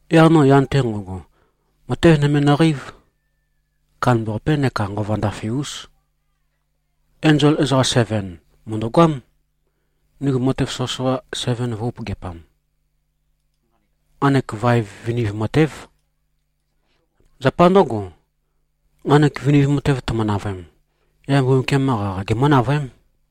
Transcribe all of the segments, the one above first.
Yaq no yan-te nqo꞉go, matev nøme nøqeív. Kandambaqapé neka nqova ndafe-ús. Enzol ezoqam seven mø̀ndøgoám, ndigu matev soqøsoqa seven vø̄-upøgeapam. Nqanek vaev viniv matév. Zapa ndǿgo, nqanek viniv matev tøme-navøem, yaq Mbumbukiam-qa qaqa gemǿ-navøém.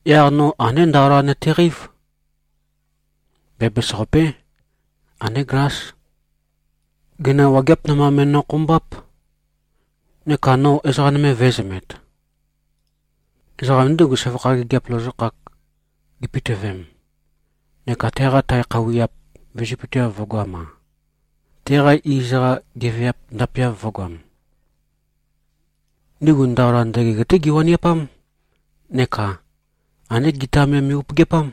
Yaq no andé ndaola nøteqeív. Bæbæs-qapé. Andé glás. Gøina wageap namba me꞉nokhombáp. Neka no ezoqa vø̄ezømet. Ezoqam ndígu, søvakha gigiap lozokhak gipitøvem neka teqa tae khøuwiap vizøpøteav vø̄goam-a, teqa iz-qa geveap ndapeav vø̄goam. Ndigu ndaola ndøgeg-té giwaniapám, neka andé gita me me꞉-upøgeapám.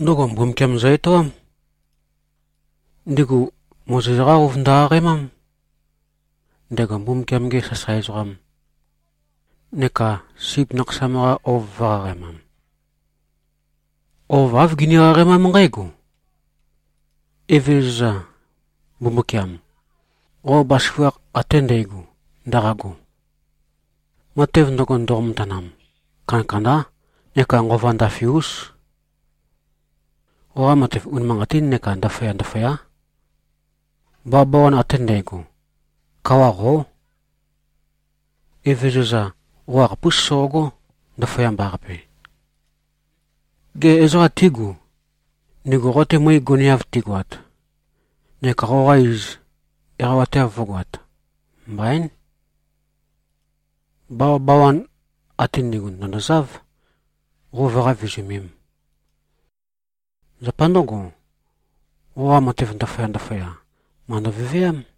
Ndøgo Mbumbukiam zø-etoám. Ndigu Mozes-qá ouv ndøqaqaemám, ndego Mbumbukiam-ge sasae ezoqam, neka Sip Nakhasam-qa ouv vø̄-qaqaemam. Ouv āv gini-qaqaemám nqǽgo: “Evezøza, Mbumbukiam, qo bazaføgakh ate ndægo ndaqago, matev ndøgo, ndoqo-matanam, kandakandá neka nqova ndafe-ús. Qoqa matev unimanqatín neka ndaføya-ndaføyá. Bawabawan ate ndægo, kawa qó. Evézøza! Qo qakhapús soqogó, ndaføyamba-qape. Gê, ezoqa tígu, ndigu qo-te møe goneav tigoat neka qoqa iz eqawateav vǿgoāt? Mbaín. Bawabawan ate ndi꞉gu, ndø̀ndozáv, qo vøqá-vizumēm. Zapa ndǿgo, qoqa matev ndaføya-ndaføya, màndo-veveám.”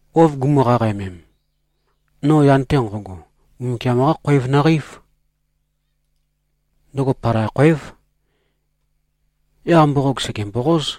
Ouv gumu-qaqaemem, no yan-te nqo꞉go, Mbumbukiam-qá khoev nøqeív. Ndøgo palai khoév. Yaq mboqog sège-mboqóz.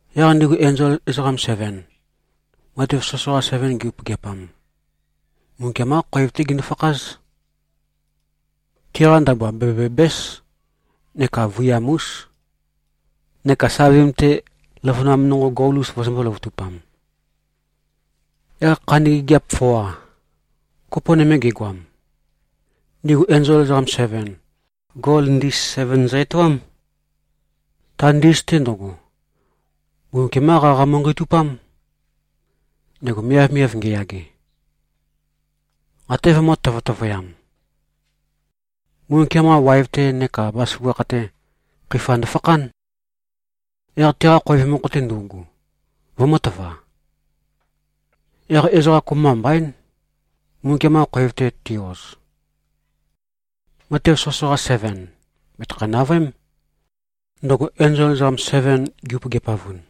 Yaq ndigu enzol ezoqam seven, matev soqøsoqa seven gi-upøgeapam, Mbumbukiam-qá khoev-té gindu-fakház. Tiqa ndabua bæbæ-bæbǽs neka vøiyam-ús, neka savim-te løvønam nonqo gol-us vøzømbō-løvøtupam. Yaq khandi gigiap foa, kopo nøme gegoam, ndigu enzol ezoqam seven, gol ndis seven zø-etoám. Ta ndis-te ndøgo, Mbumbukiam-qá qaqa mu꞉nqeitupám, ndego miavmiav ngeyage. Até vømø̄-tøtøvøyam. Mbumbukiam-qa waev-te neka bazaføgakh-te, khøifa ndofakhán, yaq teqa khoev mokho-te ndøugu, vømø̄tøva. Yaq ezoqa kopømba mbaín, Mbumbukiam-qa khoev-te ti-oz. Matev soqøsoqa seven bètøkhæ-navøém, ndøgo enzol ezoqam seven gi-upøgiapavun.